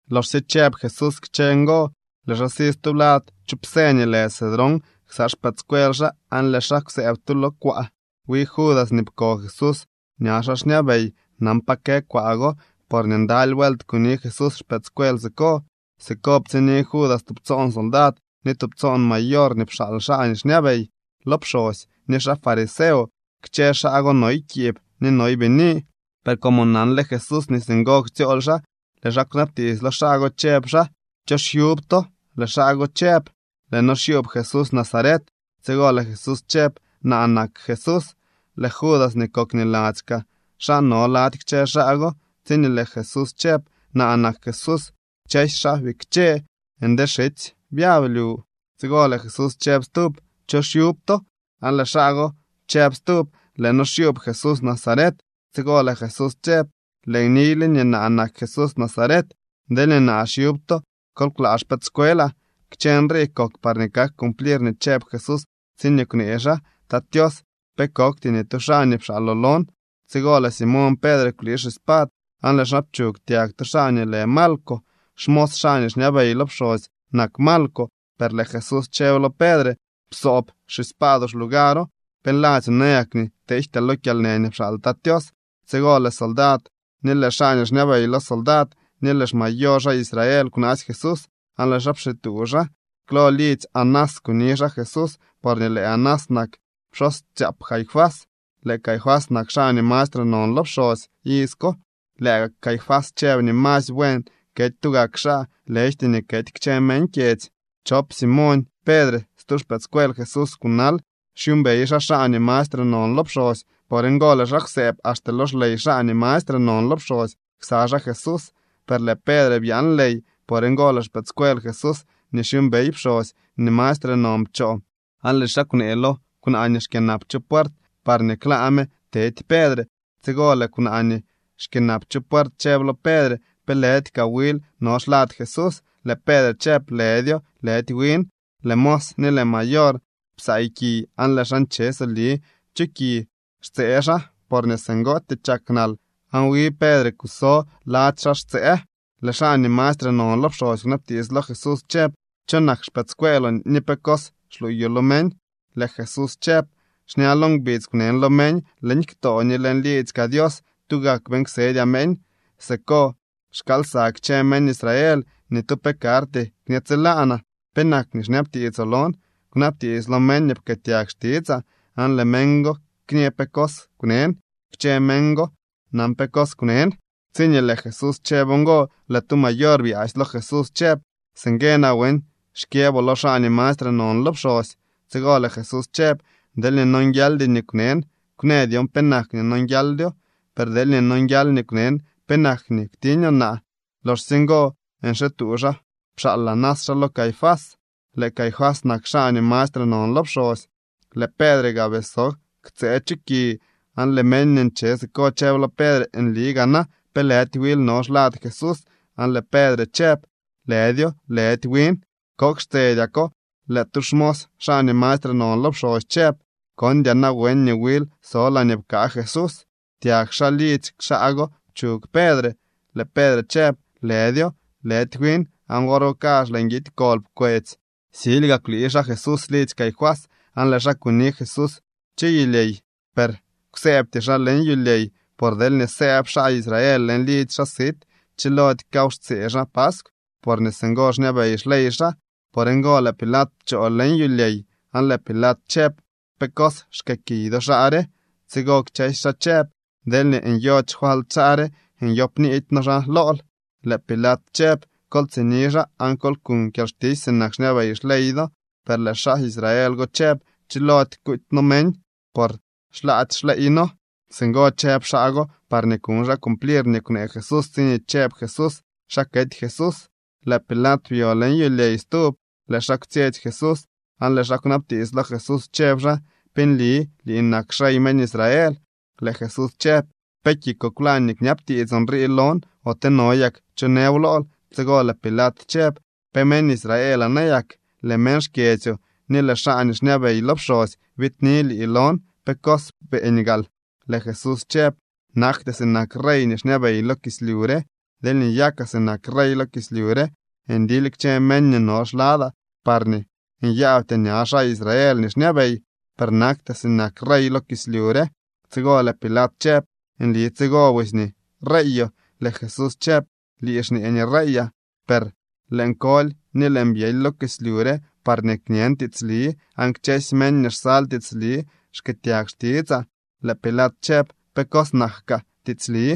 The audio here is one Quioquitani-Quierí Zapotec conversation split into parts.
Loxsye chëb Jesús kchë ngo, lëë xaa si stublad chu psë nii lë Cedrón ksa xpëëdscuel xaa aan lëë xaa kwsëëb tu lo kwaa. Wi Judas nii pko Jesús ña xaa xñabey nan pa kë kwaa go porñee ndaly vuelt kuni Jesús xpëëdscuel siko. Siko ptsiñni Judas tubtsoon soldad ni tubtsoon mayor nii pxaal xaa nii xñabey lo pxosy ni xaa fariseo. Kchë xaa go noy kiib ni noy bini. Per como nanle Jesús nii singo ktsyool xaa, lëë xaa kwnabtiits lo xaa go, chëb xaa: —¿Cho xyub to? Lëë xaa go chëb: —Lëë noo xyuub Jesús Nazaret. Tsigo lëë Jesús chëb: —Naa nak Jesús. Lëë Judas nii kok niladzy kaa xaa no lady kchë xaa go. Tsiñee lëë Jesús chëb: “Naa nak Jesús”, kchësy xaa bikche nde xitsy byab lyu. Tsigo lëë Jesús chëb stub: —¿Cho xyub to? Aan lëë xaa go chëb stub: —Lëë noo xyuub Jesús Nazaret. Tsigo lëë Jesús chëb: —Lëën niyle nii naa nak Jesús Nazaret. Deelñee naa xyub to, kol klaa xpëëdscuelaa. Kchë nrii kok parñee kak cumplir nii chëb Jesús tsiñee kwnee xaa: “Tat Tios, pe kokty ni tu xaa nii pxaaloo lon.” Tsigo lëë Simoñ Pedre kwlii xispad aan lëë xaa pchug tyag tu xaa nii lë Malco. Xmos xaa nii xñabey lo pxosy nak Malco. Per lëë Jesús chëb lo Pedre: —Psoob xispaadoo xlugaro. ¿Pe nladzyoo nayak nii teejtyaa lo kyalnë nii pxaal Tat Tios? Tsigo lëë soldad ni lëë xaa nii xñabey lo soldad ni lëë xmayor xaa Israel kwnaasy Jesús aan lëë xaa pxituu xaa. Klo lidzy Anás kuni xaa Jesús porñee lëë Anás nak pxosytsaap Caifás. Lëë Caifás nak xaa nii mastre non lo pxosy iz ko. Lëë gak Caifás chëb nii masy buen kety tugak xaa, lëjty nii kety kchë meñ kyedzy. Chop Simoñ Pedre stu xpëëdscuel Jesús kunal. Xyuumbey xaa xaa nii mastre non lo pxosy. Por ngo lëë xaa kwsëëb axte lo xley xaa nii mastre non lo pxosy ksa xaa Jesús. Per lëë Pedre byaan ley. Por ngo lëë xpëëdscuel Jesús nii xyuumbey pxosy nii mastre non pchoo, aan lëë xaa kwnee lo kwnaa nii xkyënap chu puert parñee klaa me tedy Pedre. Tsigo lëë kwnaa nii xkyënap chu puert chëb lo Pedre: —¿Pe lëdy kaa wil no xlad Jesús? Lëë Pedre chëb: —Lëdyo, lëdy win. Lëë mos ni lëë mayor psaay ki aan lëë xaa nche soli chu ki xtsëë xaa porñee singootyee chak nal. Aan wi Pedre kuso lady xaa xtsëë. Lëë xaa nii mastre non lo pxosy kwnabtiits lo Jesús chëb: —¿Cho nak xpëëdscueeloo ni pe cos xluuyoo lo meñ? Lëë Jesús chëb: —Xña lo ngbidz kwnen lo meñ. Leñ ktoo ni leñ liidzy kaa Dios tugak beeñ ksedyaa meñ. Siko xkaalsa kchë meñ Israel. Ni tu pe karty kñe tsilaanaa. ¿Penak nii xñabtiitsoo lon? Kwnabtiits lo meñ nii pkëëtyag xtitsaa, aan lëë meñ go kñë pe cos kwnen. Kchë meñ go nan pe cos kwnen. Tsiñee lëë Jesús chëb ngo, lëë tu mayor byaasy lo Jesús chëb: —¿Singue nawen xkyëboo lo xaa nii mastre non lo pxosy? Tsigo lëë Jesús chëb: —Deelñee nonguialdy nii kwnen, kwnë dyon penak nii nonguialdyo. Per deelñee nonguial nii kwnen, ¿penak nii kwtiñoo naa? Loxsye ngo nxituu xaa pxaal Anás xaa lo Caifás. Lëë Caifás nak xaa nii mastre non lo pxosy. Lëë Pedre gaa bii so ktsëë chu ki aan lëë meñ nii nche siko chëb lo Pedre: —Nli gaa na ¿pe lëdy wil no xlad Jesús? Aan lëë Pedre chëb: —Lëdyo, lëdy win. Kok xtsedyako lëë tu xmos xaa nii mastre non lo pxosy chëb: —¿Kondyaa nawen nii wil so laañee pkaa Jesús? Tyag xaa lidzy xaa go pchug Pedre. Lëë Pedre chëb: —Lëdyo, lëdy win. Aan wor go kazh lëë nguidy kol pkwetsy. Silyga kwlii xaa Jesús lidzy Caifás aan lëë xaa kuni Jesús chu yulyey. Per kwsëëbty xaa leñ yulyey, por deelñee sëëb xaa Israel leñ lidzy xaa sit, chilody kaw xtsee xaa paskw, porñee singo xñabey xley xaa. Por ngo lëë Pilat pchoo leñ yulyey, aan lëë Pilat chëb: —¿Pe cos xkëëkiy do xaa re? Tsigo kchësy xaa chëb: —Deelñee nyody xfalt xaa re, nyoopniidy noo xaa lool. Lëë Pilat chëb: —Kol tsini xaa aan kol kuñ kyalxtisy sinak xñabey xley do. Per lëë xaa Israel go chëb: —Chilody kuuty noo meñ, por xlaady xleey noo. Singo chëb xaa go parñee kuñ xaa cumplir nii kwnee Jesús tsiñee chëb Jesús xa kety Jesús. Lëë Pilat byo leñ yulyey stub, lëë xaa kwtsyetsy Jesús, aan lëë xaa kwnabtiits lo Jesús chëb xaa: —¿Pe nli lii nak xrey meñ Israel? Lëë Jesús chëb: —¿Pe kikoo kwlañ nii kñabtiitsoo nrii lon, ote no yak cho nëw lool? Tsigo lëë Pilat chëb: —¿Pe meñ Israelaa nayak? Lëë meñ xkyedzyoo ni lëë xaa nii xñabey lo pxosy biidni lii lon. ¿Pe cos beeñ gaal? Lëë Jesús chëb: —Naktyaa sinak rey nii xñabey lo kislyu re. Deelñee nyakaa sinak rey lo kislyu re, ndily kchë meñ nii no xladaa parñee nyaabtyaa ña xaa Israel nii xñabey. Per naktyaa sinak rey lo kislyu re. Tsigo lëë Pilat chëb: —¿Nli tsigo busy nii reeyoo? Lëë Jesús chëb: —Lii xñee nii reeyaa, per lëën koly ni lëën byely lo kislyu re parñee kñen tiitsli. Aan kchësy meñ nii xsal tiitsli xkëëtyag xtitsaa. Lëë Pilat chëb: —¿Pe cos nak kaa tiitsli?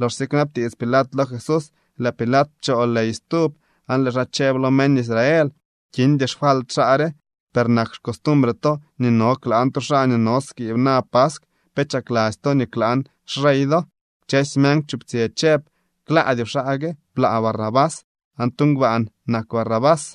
Loxsye kwnabtiits Pilat lo Jesús, lëë Pilat pchoo ley stub aan lëë xaa chëb lo meñ Israel: —Kindy xfalt xaa re. Per nak xcostumbre to nii no klaan tu xaa nii no skiib na paskw. ¿Pe chakladzy to nii klaan xrey do? Kchësy meñ kwchuptsyë chëb: —¡Klaadyoo xaa gue! ¡Blaa Barrabás! Aan tu ngbaan nak Barrabás.